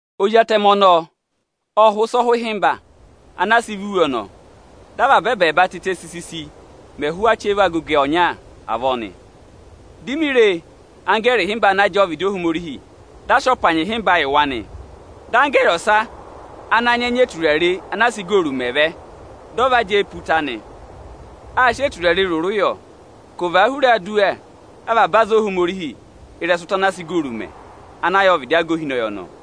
Ozi Atẹmẹ ọnọọ ộ hụ̀ ịsa ọhụhịmba ana a sị vá iwe ọnọọ, dị avaba ẹbẹẹba tịtẹ sisisi mẹ ẹhụụ achẹva agogo ọnya avọọ nị. Di mi re anggẹẹrị ịhịmba ana jẹẹ ọvịdị Ohomorihi, dị a sị ọpanyị ịhịmba yị wa nị. Dị anggẹẹrị ọsa ana nyị ẹnya eturare ana a sị igooru mẹ vẹ, dị ọ va jẹ ẹ pe ụta nị. Â sị eturare rụrụ yọ ka ọ̀ và a hura aduwa avaba aza Ohomorihi, dị ọ̀ sị ọọ nọ ị́rẹsụ ụta ana a sị igooru mẹ ana yà ọvịdị aga ohinọyị ọnọọ.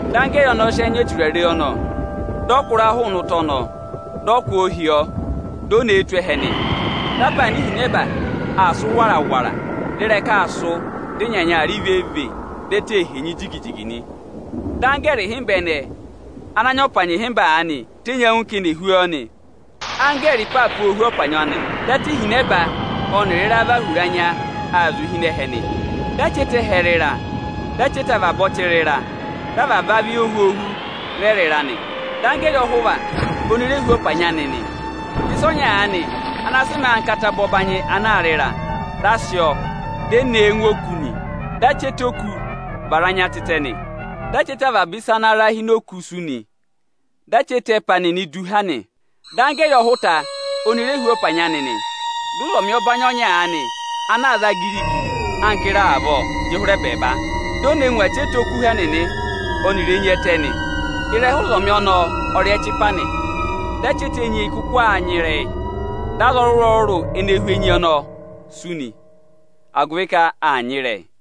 Dị anggẹẹrị ọnọọ nyị ịra hụụ ịrẹsụ ụta ọnọọ tụ́ ịnị ẹnya eturare ọnọọ ohihi, dị o ne e na ngụ ẹhẹ nị, Dị apaana ihinẹba aa sụ́ wara-wara, dị ịrẹka aa sụ́, dị ịnyanya aa rị vee-vee, dị ẹtẹ ee henyi jigi-jigi nị. Dị anggẹẹrị ịhịmba ẹnẹẹ ana nyị ọpanyị ịhịmba aanị tenyi ẹngụ ka eni è hú ọọ nị. Anggẹẹrị ịpaapa ô hú ọpanyị anị. Dị ata ihinẹba ọnịrị ịra và hura anya aa zụ̀ụ hi ịnị ẹhẹ nị. Dị achẹta ẹhẹ rị ịra, dị achẹta avaba ọchị rị ịra, dị avaba ohwoohu rẹ rị ịra nị. Dị anggẹẹrị ọhụva oni re hú ọpanyị anị nị. Dị a sị ịsa ọnya aanị ana sị mẹẹ anka ataba ọbanyị ana aa rị ịra, di e ne e ngụ ini òkū nị. Dị achẹta oku vara anya tịtẹ nị. Dị achẹta avaba ịsa ana ra hi ini òkū sú nị; dị achẹta ẹpa nịnị du va ha nị. Dị anggẹẹrị ọhụta oni re hú ọpanyị anị nị. Dị ụzọmị ọbanyị ọnya ana aa za giri-giri anka ịra avọọ jị hụrẹ ẹbẹẹba, di o ne ngụ achẹta irehu nịnị ọnịrị enyi ẹtẹ nịnị nị. Ịrẹha ụzọmị ọnọọ ọ rị ẹchịpa nị. Dị achẹta enyi ẹnẹẹ kụkụ aa nyịrẹyị, dị aza ọrụrụ-ọrụrụ ene hú enyi ọnọọ sú, agụvị ka aa nyịrẹyị nị.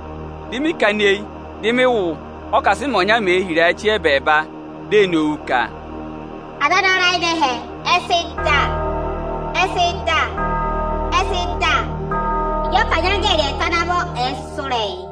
Dị mị kana eyi, dị mị wụ́, ọ́kasịmẹ ọnya mee hira ẹbẹẹba, di ee nowu ka: aza ana ra ịnị ẹhẹ ẹ sị da. Ẹ sị da. Ẹ sị da, ịjị ọpanyị anggẹẹrị ẹẹta ana vọ ẹ̀ẹ sụ́ ịrẹyị!